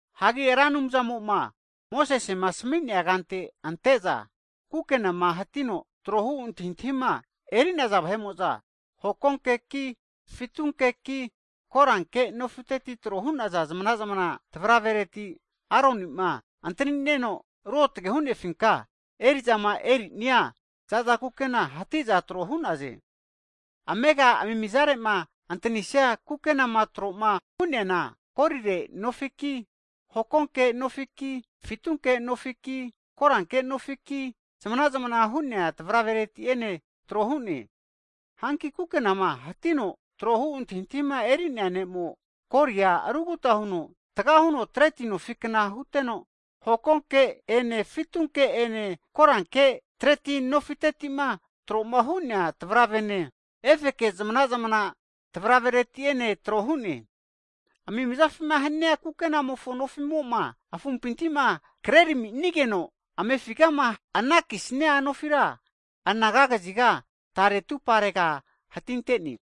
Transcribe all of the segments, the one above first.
Hagi Ra Anumzamo'ma Mosesema asami'nea kante ante'za kukenama hatino tro hu antahintahima eri'naza vahe'mo'za, hokonkeki fitunkeki koranke nofiteti tro hu'naza zmana'zmana tavravereti, Aroni'ma antani'neno ruotage hu'nefinka eri'zama eri'nia za'za kukena hati'za tro hu'naze. Amega amimizare'ma antanisia ku kenama tro'ma hu'neana, golire nofiki hokonke nofiki, fitunke nofiki, koranke nofitetiki zmana'zamna hu'nea tavravereti'ene tro hu'ne. Hanki kukenama hatino tro hu antahintahima eri'nea ne'mo, golia aruguta huno erita'ori huteno, taga huno treti nofikna huteno hokonke ene fitunke ene koranke treti nofiteti'ma tro'ma hu'nea tavravene, efeke zamana'zamana tavravereti'ene tro hu'ne. Amimizafima hania kukenamofo nofi'mo'ma afumpinti'ma kreraminigeno amefigama anakisnia nofira, anaga kaziga tare atumparega hatinte'ne.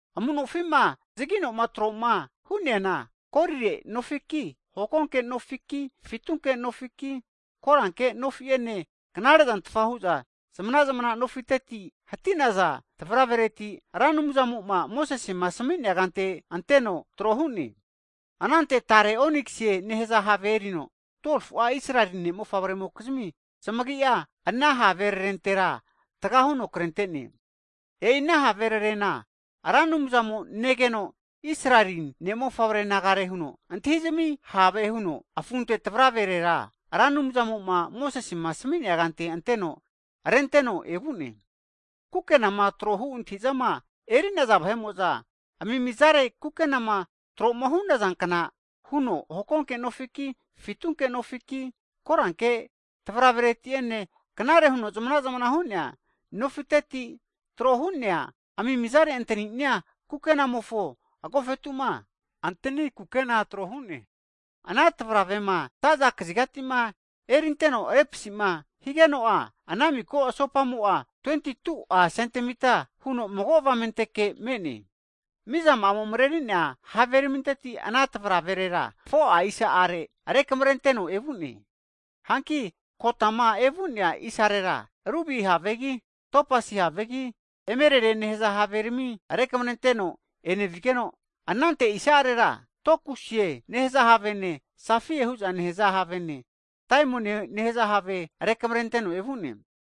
Amu'nofi'ma zagino'ma tro'ma hu'neana, golire nofiki, hokonke nofiki, fitunke nofiki, koranke nofi'ene knare zantfa hu'za zmana'zmana nofiteti hati'naza tavaravereti Ra Anumzamo'ma Mosesema asami'nea kante anteno tro hu'ne. Anante tare oniksie nehaza have erino 12fu'a Israeli ne' mofavre'mokizmi zamagia, ana haverarentera taga huno krente'ne. E'i ana haverarena Ra Anumzamo negeno Israeli (Jekopu) ne' mofavre nagare huno antahi'zmi have huno afunte tavraverera Ra Anumzamo'ma Mosesema asami'nea kante anteno renteno evu'ne. Kukenama tro hu antahi'zama eri'naza vahe'mo'za, amimizare kukenama tro'ma hu'nazankna huno, hokonke nofiki, fitunke nofiki, koranke tavravereti'ene knare huno zmana'zmana hu'nea nofiteti tro hu'nea amimizare antani'nia kukenamofo agofetu'ma antani kukena tro hu'ne. Ana tavravema za'za kazigati'ma erinteno repasi'ma higeno'a ana miko asopa'amo'a 22'a sentemita huno mago avamenteke me'ne. Mizama'amo mareri'nea haveraminteti ana tavraverera 4'a isa'are rekamarenteno evu'ne. Hanki kotama evu'nea isarera rubi havegi, topasi havegi, emerelie nehaza haverami rekamrenteno enevuno, anante isa'arera, tekuoisie nehaza havene, safaia hu'za nehaza havene, daimonie nehaza have rekamrenteno evu'ne.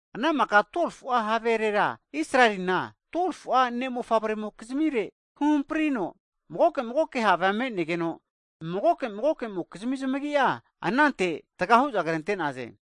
Ana maka 12fu'a haverera Israelina (Jekopu) 12fu'a ne' mofavremokizmire huhamprino magoke magoke havea me'negeno, mago mago mokizmi zamagi'a anante taga hu'za krente'naze.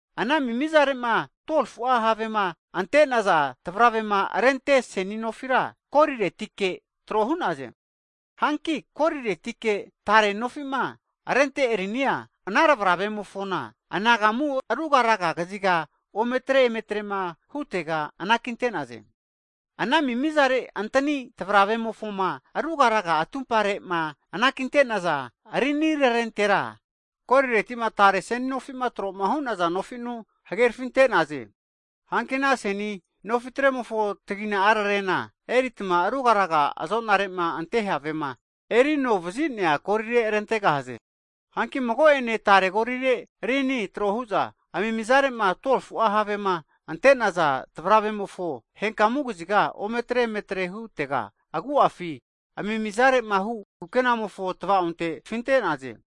Ana amimizare'ma 12fu'a havema ante'naza tavravema rente seni nofira, goliretike tro hu'naze. Hanki goliretike tare nofi'ma rente rinia ana tavravemofona anagamu ruga raga kaziga ometre emetrema hutega anakinte'naze Ana amimizare antani tavravemofoma rugaraga atumpare'ma anakinte'naza rinirarentera, goliret'ma tare seni nofi'ma tro'ma hu'naza nofi'nu hagerafinte'naze. Hanki ana seni nofitremofo tagina'rarena eritma rugaraga azonare'ma ante havema eri novazinea golire rentegahaze. Hanki mago ene tare golire rini trohu'za amimizare'ma 12fu'a havema ante'naza tavravemofo henkamu kaziga ometre emetre hutega, agu'afi amimizare'ma hu kukenamofo tvaonte tafinte'naze.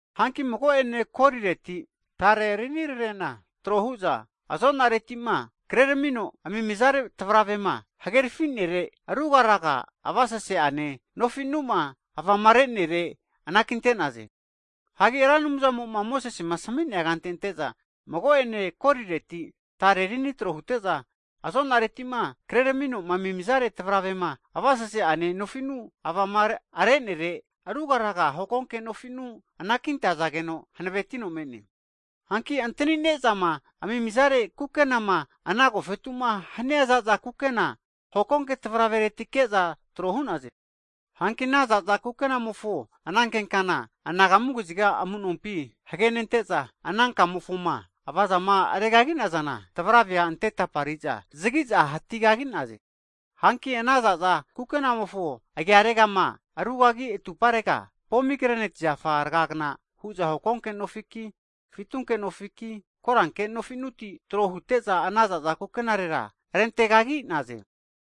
Hanki mago'ene golireti tare rinirarena tro hu'za azo'nareti'ma kreramino amimizare tavravema hagerafi'nere ruga raga avasase'ane nofi'nu'ma avamare'nere anakinte'naze. Hagi Ra Anumzamo'ma Mosesema asami'nea kante ante'za, mago'ene golireti tare rini tro hute'za, azonareti'ma kreramino amimizare tavravema avasase'ane nofi'nu avama are'nere ruga raga hokonke nofi'nu anakintazageno hanavetino me'ne. Hagi antanine'zama amimizare kukenama ana agofetu'ma hania za'za kukena, hokonke tavraveretike'za tro hu'naze. Hanki ana za'za kukenamofo ananke kana anagamu kaziga amu'nompi hagenente'za, ana kamofoma avazama regagi'nazana tavravea ante tapari'za zagi'za hatigagi'naze. Hanki ana za'za kukenamofo agiaregama rugagi atumparega, pomigreneti zafa rgagna hu'za hokonke nofiki, fitunke nofiki, koranke nofinuti tro hute'za ana zaza kukenarera rentegagi'naze.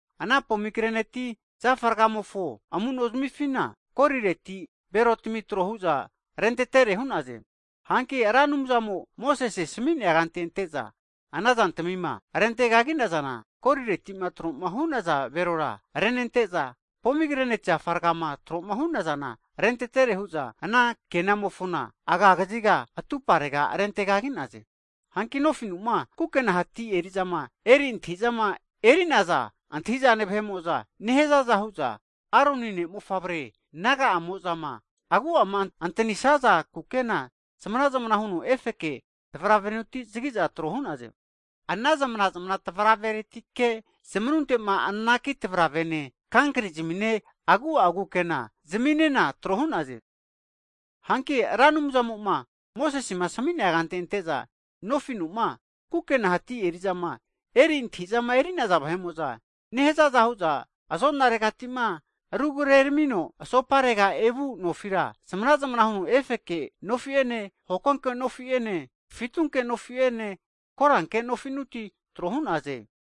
Ana pomigreneti zafa rgaramimofo amu'nozmifina, golireti belotami tro hu'za rentetere hu'naze. Hanki Ra Anumzamo'ma Mosese'ma asami'nea kante ante'za ana zantamima rente kagi'nazana, golireti'ma tro'ma hu'naza belora renente'za, pomigreneti zafa rgama tro'ma hu'nazana rentere hu'za ana kenamofona aga kaziga atuparega rente kagi'naze. Hanki nofi'nu'ma kukena hati eri'zama eri antahi'zama eri'naza antahi'zane vahe'mo'za nehazaza hu'za Aronine mofavre na'agamo'zama agu'ama antanisaza kukena zmana'zmana huno efeke tavravenuti zagi'za tro hu'naze. Ana zmana'zamana tavraveretike zmanunte'ma anaki tavravene kankri'zamine agu'a kukena zaminena tro hu'naze. Hanki Ra Anumzamo'ma Mosesema asami'nea kante ante'za, nofi'nu'ma kukena hati eri'zama eri antahi'zama eri'naza vahe'mo'za nehazaza hu'za, azo'naregati'ma rugreramino asoparegama evu nofira zmana'zmana huno efeke nofi'ene, hokonke nofi'ene, fitunke nofi'ene, koranke nofinuti tro hu'naze.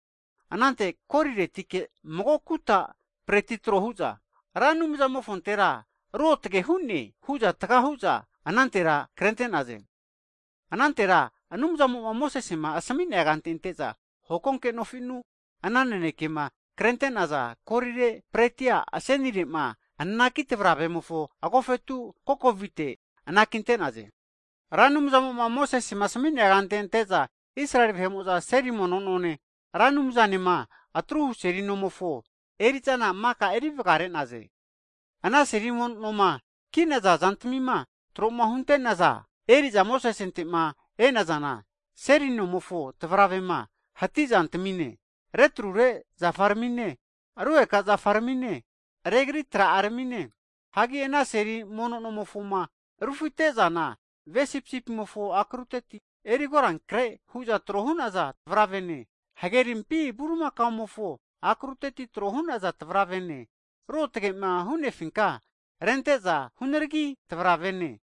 Anante goliletike mago kuta zompa tro hu'za, Ra Anumzamofontera ruotage hu'ne hu'za taga hu'za anantera krente'naze. Anantera Anumzamo'ma Mosesema asami'nea kante ante'za hokonke nofi'nu ana nanekema krente'naza golire zompa asenire'ma anaki tavravemofo agofetu kokovite avona anakinte'naze. Ra Anumzamo'ma Mosesema asami'nea kante ante'za Israeli vahe'mo'za seli mono none Ra Anumzanema atruhu seli nomofo eri'zana maka eri vagare'naze. Ana seli mono noma ki'naza zantamima tro'ma hunte'naza, eri'za Mosesente'ma e'nazana, seli nomofo tavravema hanti zantamine, retrure zafaramine, rugeka zafaramine, regri tra'aramine, hagi ana seli mono nomofoma rufite'zana, ve sipisipimofo akruteti eri korankre hu'za tro hu'naza tavravene, hage rimpi bulimakaomofo akruteti tro hu'naza tavravene, ruotage'ma hu'nefinka rente'za hunaragi tavravene,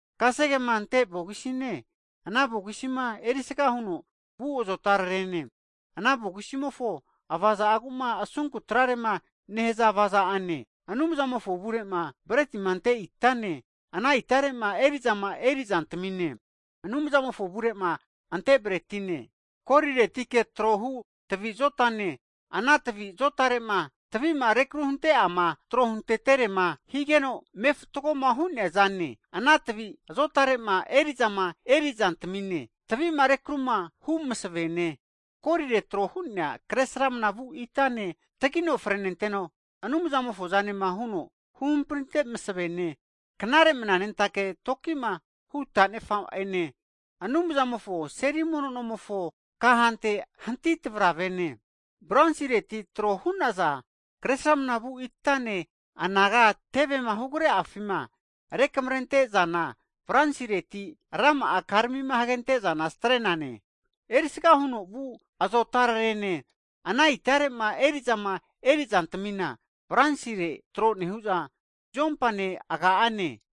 kasegema ante vogisine ana vogisima erisga huno vu azotarerene, ana vogisimofo avaza'agu'ma asunku trarema nehaza avaza'ane, Anumzamofo avure'ma bretima ante itane, ana itare'ma eri'zama eri'zantamine, Anumzamofo avure'ma ante bretine, goliretike tro hu tavi zotane, ana tavi azotare'ma tavi'ma rekru hunte'ama tro hunteterema higeno me' fatgoma hu'nea zane, ana tavi azotare'ma eri'zama eri zantamine, tavi'ma rekruma hu masavene, golire tro hu'nea kresramna vu itane, tagino frenenteno Anumzamofo zanema huno huhamprinte masavene, knare mnanentake toki'ma hu' tanefa'ene, Anumzamofo seli mono nomofo kahante hanti tavravene, bronsireti tro hu'naza kresramnavu itane, anaga tevema hugre'afima rekamrente zana bronsireti rama'a karami hagente'zana strenane, erisga huno vu azotararene, ana itare'ma eri'zama erizantamina bronsire tro nehu'za zuompane, aga'ane,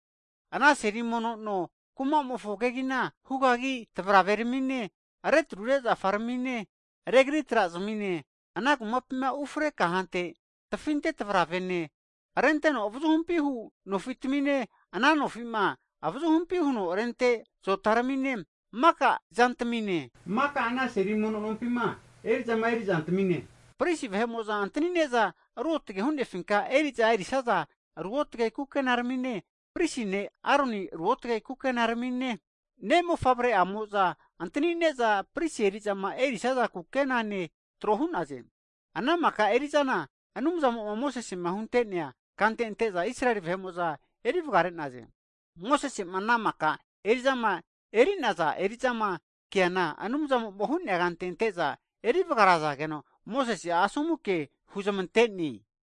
ana seli mono no kumamofo kegina hugagi tavraveramine, retrure zafarmine, regri trazmine, ana kumapima ufre kahante tafinte tavravene, renteno avazuhumpi hu nofitamine, ana nofi'ma avazuhumpi huno rente zotaramine, maka ana seli mono nompima eri'zama eri zantamine, pristi vahe'mo'za antani'ne'za ruotage hu'nefinka eri'za erisaza ruotage kukenaramine, pristi ne' Aroni ruotage kukenaramine, ne'mofavre'aramimo'za antanine'za pristi eri'zama erisaza kukenane tro hu'naze. Ana maka eri'zana Anumzamo'ma Mosese'ma hunte'nea kante ante'za Israeli vahe'mo'za eri vagare'naze. Mosese'ma ana maka eri'zama eri'naza eri'zama keana Anumzamo'ma hu'nea kante ante'za eri vagarazageno, Mosese'a asomu kea huzmante'ne.